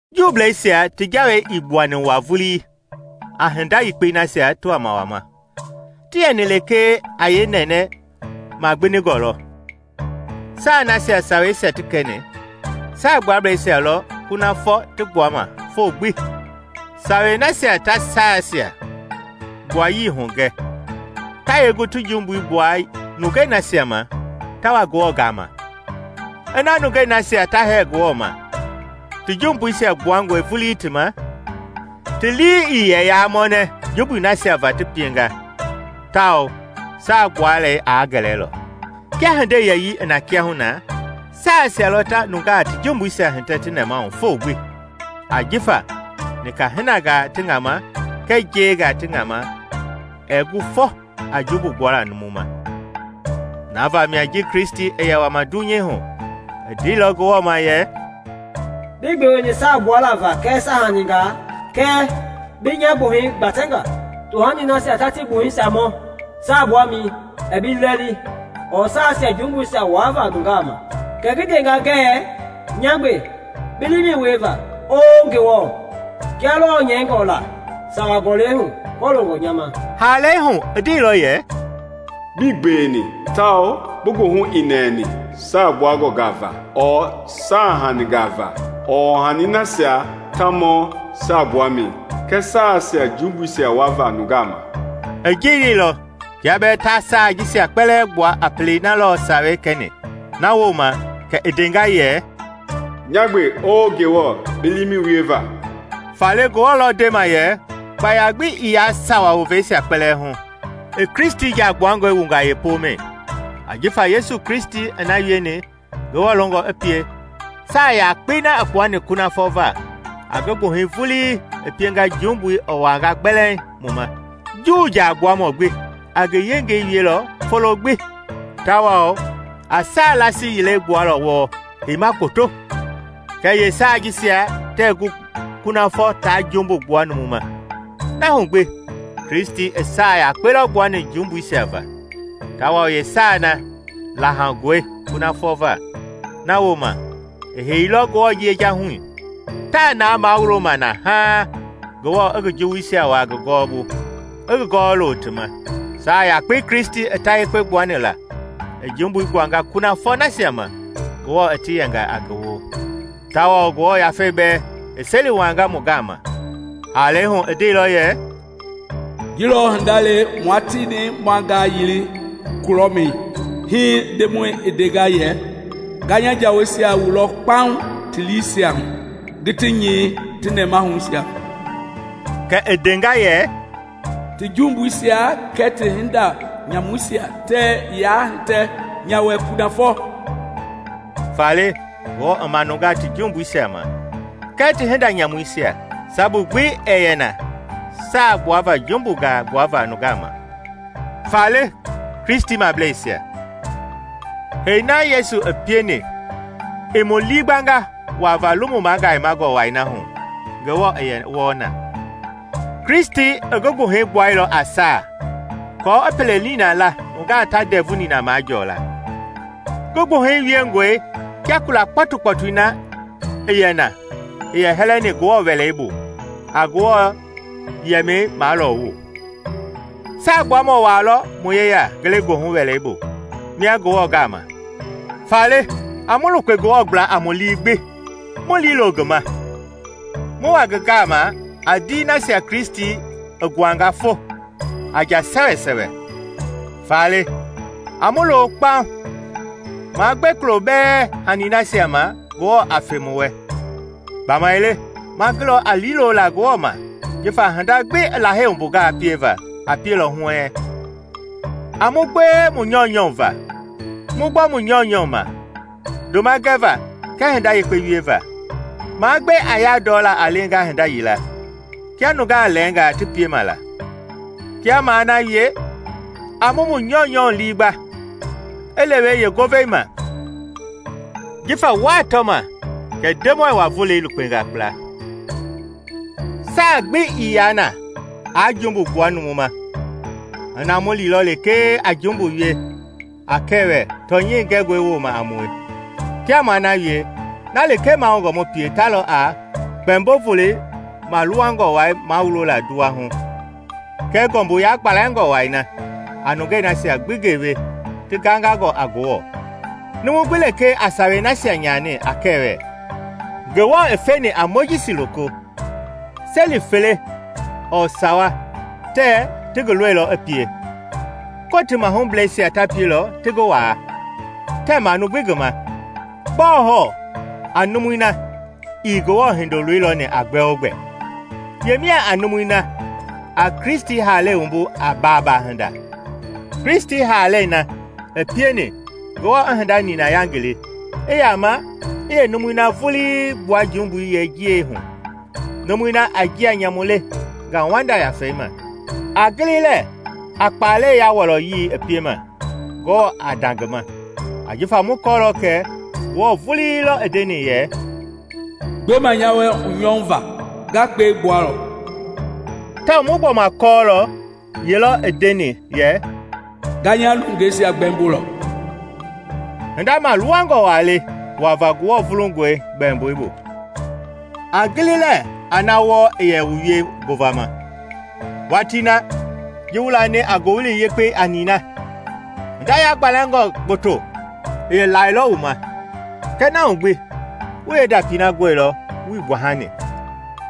Juubleisia ti jawei ii gbuani waa vuli a hinda yekpei nasia ti wama wama; ti yɛni lekee a yeenɛnɛ magbindingɔ lɔ. Saa nasia saweisia ti kɛni, Saagbuablɛisia lɔ kunafɔ ti gbuama foo gbi. Sawei nasia ta saasia gbuayii hugɛ, ta yee gu ti jumbui gbua nungei nasia ma ta wa Ngewɔ gaama? Ina nungei nasia ta hɛɛ Ngewɔ ma ti jumbuisia gbuangɔi vulii ti ma, ti lii i yɛ yaa mɔnɛ jumbui nasia va ti pienga tawao saa gbualei aa gɛlɛlɔ. Kia hindei yɛyii i na kiahuna, saasia lɔ ta nungaa ti jumbuisia hitɛ ti nɛmahu foo gbi. Ajifa nika-hinangaa ti ŋama kɛɛ njengaa ti ŋama ɛɛ gu fɔ a jumbu gbuala numu ma. Na vamia ji Kristi i yɛ wama dunyei hu, i ndeilɔ Ngewɔ ma yɛ, “Bii gbeweni saa gbuala va kɛɛ saahaningaa kɛɛ bi nya gbuhɛi gbatɛnga. Tohani nasia ta ti gbuhɛi mɔ saagbuamɛi ɛɛ bi lii lɛli ɔɔ saasia jumbuisia wuava nungaa ma. Kɛ ngi ndenga ngɛɛ, ‘Nya gbe bi liimɛi wieva, Oo Ngewɔ, kia lɔɔ nyɛingɔ la sawa gɔlɛi hu kɔloongɔ nya ma.’” Haalɛi hu i ndeilɔ yɛ, “Bii gbeweni tawao bi goohu ɛɛ nɛɛ saa gbuangɔngaa va ɔɔ saahaningaa ɔɔ tohani nasia ta mɔ saagbuamɛi kɛɛ saasia jumbuisia wuava nungaa ma.” I ji leilɔ kia bɛɛ ta saa jisia kpɛlɛɛ gbua a pelei na lɔ Sawei kɛni. Na wooma kɛ i ndenga yɛ, “Nya gbe, Oo Ngewɔ, bi liimɛi wieva.” Faale Ngewɔ lɔ ndema yɛ kpaya gbi ii yaa sawa woveisia kpɛlɛɛ hu, i Kristi jaa gbuangɔi wunga yeepomɛi. Ajifa Yesu Kristi i na wieni Ngewɔ longɔ i pie, saa yakpei na i kpuani kunafɔ va a ngi gbuhɛi vulii i pienga jumbui i wuanga gbɛlɛŋ mu ma. Juu Jaagbuamɔ gbi a ngi yengei wielɔ folo gbi tawao a saa laasi yilei gbualɔ wɔɔ heima gboto; kɛɛ yeesaa jisia tɛɛ gu kunafɔ taa jumbu gbua numu ma. Na hu gbi Kristi i saa yakpe lɔ gbuani jumbuisia va, tawao yeesaa na laahoungɔe kunafɔ va, na wooma i heiilɔ Ngewɔ yejahui. Taa na mawuloma na haaŋ Ngewɔ i ngi juwuisia wuaa ngi gɔwɔbu i gɔwɔ lo ti ma. Saa yakpei Kristi i ta yekpe gbuani la i jumbui gbuanga kunafɔ nasia ma Ngewɔ i ti yɛnga a ngi woo. Tawao Ngewɔ Yafei bɛɛ i seli wuanga mu gama. Haalɛi hu i ndeilɔ yɛ, “Ji lɔ hinda le mua tieni ma ngangili kulɔmɛi, hii Ndemɔi i ndenga yɛ: Nga nya jaweisia wulɔ kpaŋ ti liisia hu ngi ti nyɛi ti nɛmahuisia.” Kɛ i ndenga yɛ, “Ti jumbuisia kɛɛ ti hinda nyamuisia tɛɛ yaa hitɛ nya wɛ kunafɔ.” Faale Ngewɔ i manunga ti jumbuisia ma kɛɛ ti hinda nyamuisia, sabu gbi ɛɛ yɛ na saa gbuava jumbungaa gbuava nungaa ma. Faale, nya Kristimableisia, hei na Yesu i pieni i mu liigbanga wuava, Lomu Magayemangɔ Wai na hu Ngewɔ i yɛ wɔɔ na. Kristi i ngi gbuhɛi gbuailɔ a saa aako i pele nina la nungaa ta ndɛvu nina majɔɔ la. Ngi gbuhɛi wiengɔe kia kula kpɔtukpɔtui na i yɛ na i yɛ hɛlɛni Ngewɔ Wɛlei bu a Ngewɔ yɛmɛi maalɔɔwu. Saagbuamɔ waa lɔ mu yeya ngelegoohu wɛlei bu mia Ngewɔ gama. Faale a mu lukpe Ngewɔ gbla a mu lii gbi mu liilo ngi ma, mu wa ngi gaama a ndii nasia Kristi i nguanga fo a njaa sɛwɛsɛwɛ. Faale a mu lo kpaŋ, maa gbe kulo bɛɛ hani nasia ma Ngewɔ a fe mu wɛ, gbamaile ma gulɔ a liilola Ngewɔ ma jifa hinda gbi i Lahei wumbungaa pieva a pielɔ huɛɛŋ. A mu gbewe mu nyɔunyɔu va, mu gbɔ mu nyɔunyɔu ma ndoma gɛva kɛɛ hinda yekpe wieva. Maa gbe a yandɔla a lenga hinda yila, kia nungaa lɛɛngaa ti piema la. Kia maa na wie, a mu mu nyɔunyɔu lii gba i lewe yeengovei ma, jifa wuaa tɔma Ndemɔi wa-volei lukpenga kpla. Saa gbi ii yaa na aa jumbu gbua numu ma ina mu liilɔ lekee a jumbu wie a kɛwɛ tɔnyɛi gɛngɔi wooma a mue. Kia maa na wie, na lekee mahoungɔ mu pie ta lɔ a Kpɛmbo-Volo maluwangɔ wai mawulola nduwa hu, kɛɛ ngɔmbu yagbalɛngɔ wai na a nungei nasia gbi gewe ti gangangɔ a Ngewɔ. Numu gbi lekee a sawei nasia nyani a kɛwɛ Ngewɔ i feni a Mojisi loko, seli fele ɔɔ sawa tɛɛ ti ngi lɔilɔ i pie, Kotii mahublɛisia ta pielɔ ti ngi waa, tɛɛ manu gbi ngi ma. Gbɔɔ hɔɔ a numui na ii Ngewɔ Hindoloi lɔni a gbɛogbɛ? Yemia a numui na a Kristi haalɛi wumbu a baabaa-hinda, Kristi haalɛi na i pieni Ngewɔ i hinda nina yangili, i yama i yeenumui na vulii gbua jumbui yeenjiɛi hu, numui na a njia nyamu le ngauwanda Yafei ma? A gili lɛɛ a kpaalɛi ya wɔlɔyii i piema Ngewɔ a nda ngi ma! Ajifa mu kɔɔlɔ kɛ Ngewɔ vulii lɔ i ndeni yɛ, “Gbema nya wɛ hunyɔu va, nga kpɛi gbualɔ;” tawao mu gbɔma kɔɔlɔ ye lɔ i ndeni yɛ, “Nga nya nungeisia gbɛmbolɔ.” Hinda maaluwangɔ waa le wuava Ngewɔ vulungɔi gbɛmboi bu. A gili lɛɛ a na wɔɔ i yɛ wu wie ngovama. Watii na, ji wu lani a Ngowili Yekpei a nina, hinda yagbalɛngɔ gboto i lailɔ wu ma, kɛɛ na hu gbi wu yeendapii na gɔilɔ wuii gbahani.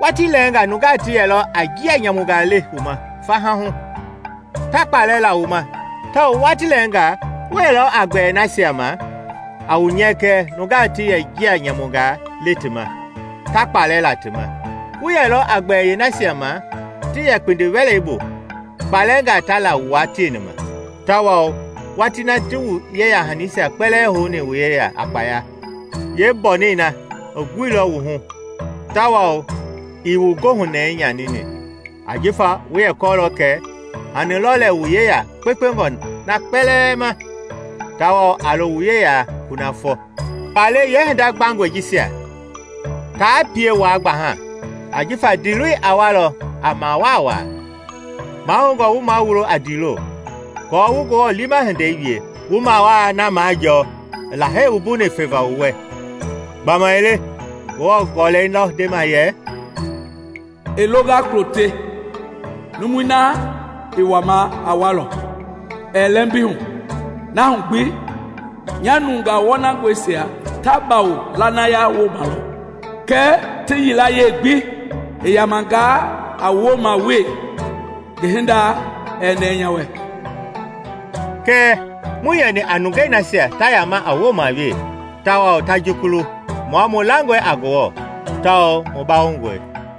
Watii lɛɛngaa nungaa ti yɛlɔ a njia nyamungaa le wu ma faha hu, ta kpaalɛ la wu ma tawao watii lɛɛngaa wu yɛlɔ a gbɛɛ nasia ma a wu nyɛkɛ nungaa ti yɛ njia nyamungaa le ti ma, ta kpaalɛ la ti ma. Wu yɛlɔ a gbɛɛ yeenasia ma ti yɛ kpindi-wɛlei bu kpaalɛɛngaa ta la wua tieni ma, tawao watii na ti wu yeya- hanisia kpɛlɛɛ houni wu yeya a kpaya, yeembɔnɛi na i guilɔ wu hu tawao ii wu goohunɛɛi nyanini, ajifa wu yɛ kɔɔlɔ kɛ hani lɔ lɛ wu yeya kpekpengɔ na kpɛlɛɛ ma, tawao a lo wu yeya kunafɔ. Faale yeehinda gbangɔi jisia taa pie waa gbaha ajifa ndiiloi a walɔ a mawaa wa. Mahoungɔ wu mawulo a ndiilo, aako wu Ngewɔ liima hindei wie, wu mawaa na majɔɔ i Lahei wumbuni feva wu wɛ. Gbamaile Ngewɔ Gɔlɛi lɔ ndema yɛ, “I longa kulo te, numui na i wama a walɔ, ɛɛ lɛmbi hu; Na hu gbi, nya nungaa wɔnangɔisia ta bawo lanaya wooma lɔ; kɛɛ ti yilayee gbi i yamangaa a wooma wee, ngi hinda ɛɛ nɛɛ nya wɛ.” Kɛɛ muii yɛni a nungei nasia ta yama a wooma wee tawao ta jukulu. Mua mu langɔe a Ngewɔ tawao mu bawongɔe.